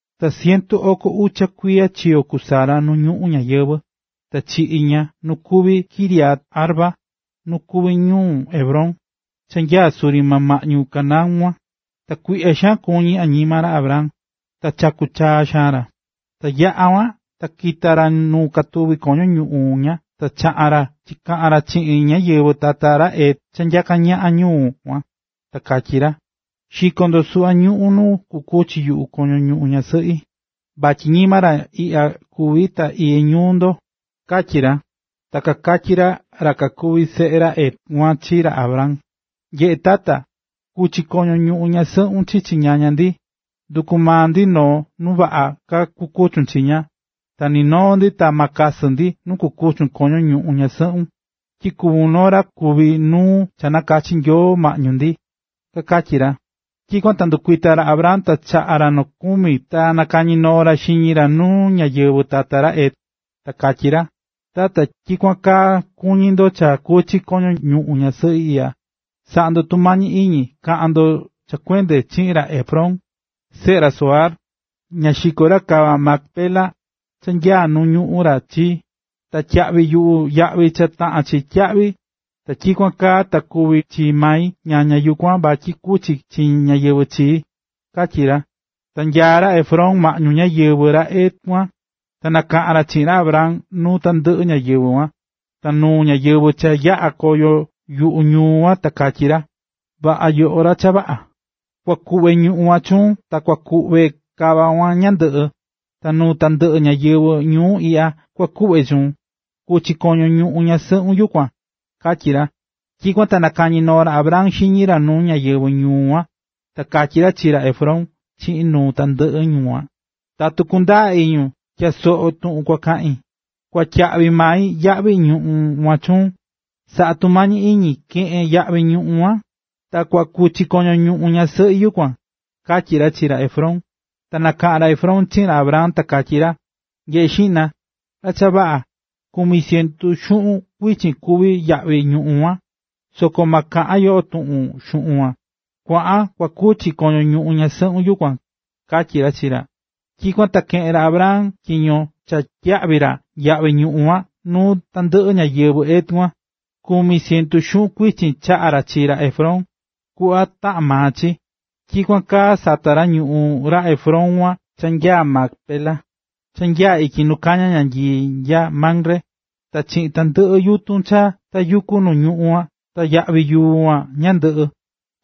Ta cientu oko ucha kuiya chiyo̱ ku Sara nu ñuꞌún ñayɨvɨ̱. Ta chiꞌi̱ ña nu kuví Kiriat-arba, nu kuví ñuu Hebrón, cha nyaá suri maa ñuꞌún Canaán kuan. Ta kuiꞌya̱ xaan kuñí añima ra Abraham, ta chaku̱ chaa xaan ra. Ta yaꞌa̱ kuan ta kita̱ ra nu katuví koño ñuꞌún ña ta chaꞌa̱n ra chikaꞌa̱n ra chiꞌin ñáyɨvɨ tata ra Het cha nyaká ñaꞌan ñuꞌún kuan, ta katyí ra: ―Xi̱ko ndo suꞌva ñuꞌún nu kukuchi yuꞌu koño ñuꞌún ñasɨꞌi, vatyi ñima ra ñuu iꞌya kuví ta iyé ñuu ndo ―katyí ra. Ta kakatyí ra kakuví seꞌe ra Het kuan chi ra Abraham: ―Nyeꞌe̱ tata, ku̱chi koño ñuꞌún ñasɨꞌun chichi ñaña ndi, nduku maun noo nuu vaꞌa ka kuchun chi ña, ta ni noo ndi ta ma kasɨ ndi nu kukuchun koño ñuꞌún ñasɨꞌun. Tyi kuvún noo ra kuví nuu cha nakachi̱ Nyoo maꞌñu ndi ―kakatyí ra. Tyikuan ta ndukuita̱ ra Abraham ta chaꞌa̱ ra nokumi ta nakañi noo ra xiñi ra nu ñáyɨvɨ tata ra Het. Ta katyí ra: ―Tatu tyikuan kaa kuñí ndo cha kuchi koño ñuꞌún ñasɨꞌi iꞌya, sa̱ꞌa ndo tumañi iñi ka̱ꞌan ndo cha kuende chiꞌin ra Efrón, seꞌe ra Zohar, na xiko ra kava Macpela, cha nya nuu ñuꞌún ra chii, ta tyiyaꞌvi yuꞌu yaꞌvi cha taꞌán chi tyiyaꞌvi, ta tyikuan kaa ta kuví chi mai ñaña yukuan vatyi kuchi chi ñáyɨvɨ chii―katyí ra. Ta nyaá ra Efrón maꞌñu ñáyɨvɨ ra Het kuan, ta nakaꞌa̱n ra chiꞌin ra Abraham nuu tandɨꞌɨ ñáyɨvɨ kuan, ta nuu ñáyɨvɨ cha yaꞌá koyo yuꞌu ñuu kuan, ta katyí ra: ―Vaꞌa, yoꞌo ra cha vaꞌa. Kua kuꞌve ñuꞌún kuan chuun ta kua kuꞌve kava kuan ñandɨꞌɨ. Ta nuu tandɨꞌɨ ñáyɨvɨ ñuu iꞌya kua kuꞌve chuun. Ku̱chi koño ñuꞌún ñasɨꞌun yukuan ―katyí ra. Tyikuan ta nakañi̱ noo ra Abraham xiñi ra nuu ñáyɨvɨ ñuu kuan. Ta katyí ra chi ra Efrón chiꞌin nuu tandɨꞌɨ ñu kuan: ―Tatu kundaa iñun, tya̱a soꞌo tuꞌun kua kaꞌin, kua tyiyaꞌvi mai yaꞌvi ñuꞌún kuan chuun. Sa̱ꞌa tumañi iñi ke̱ꞌen yaꞌvi ñuꞌún kuan. Ta kua kuchi koño ñuꞌún ñasɨꞌi yukuan ―katyí ra chi ra Efrón. Ta nakaꞌa̱n ra Efrón chiꞌin ra Abraham ta katyí ra: ―Nye̱ꞌe xiꞌna, ra cha vaꞌa, kumi cientu xuꞌun kuichin kuví yaꞌvi ñuꞌún kuan, soko ma kaꞌan yo tuꞌun xuꞌun kuan. Kua̱ꞌan kua kuchi koño ñuꞌún ñasɨꞌun yukuan―katyí ra chi ra. Tyikuan ta keꞌe̱n ra Abraham tyiño cha tyiyaꞌvi ra yaꞌvi ñuꞌún kuan nuu tandɨꞌɨ ñáyɨvɨ Het kuan, kumi cientu xuꞌun kuichin chaꞌa̱ ra chi ra Efrón, kuꞌva taꞌán maa chi. Tyikuan kaa sata̱ ra ñuꞌún ra Efrón kuan cha nyaá Macpela, cha nyaá ityi nu kañá ñanyii nya Mamre, ta chiꞌin tandɨꞌɨ yutun cha tayukú nu ñuꞌún kuan ta yavi yuu kuan ñandɨꞌɨ.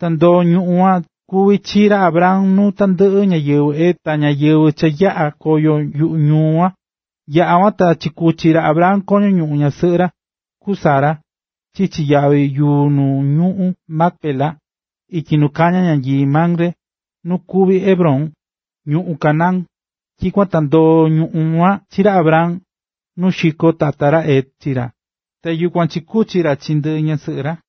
Ta ndoo̱ ñuꞌún kuan kuví chi chii ra Abraham nuu tandɨꞌɨ ñáyɨvɨ Het ta ñáyɨvɨ cha yaꞌá koyo yuꞌu ñuu kuan. Yaꞌa̱ kuan ta chikuchi̱ ra Abraham koño ñuꞌún ñasɨꞌɨ ra, ku Sara, chichi yavi yuu nu ñuꞌún Macpela, ityi nu kañá ñanyii Mamre, nu kuví Hebrón, ñuꞌún Canaán. Tyikuan ta ndoo̱ ñuꞌún kuan chi ra Abraham, nu xiko̱ tata ra Het chi ra, ta yukuan chikuchi̱ ra chi ndɨ ñasɨꞌɨ ra.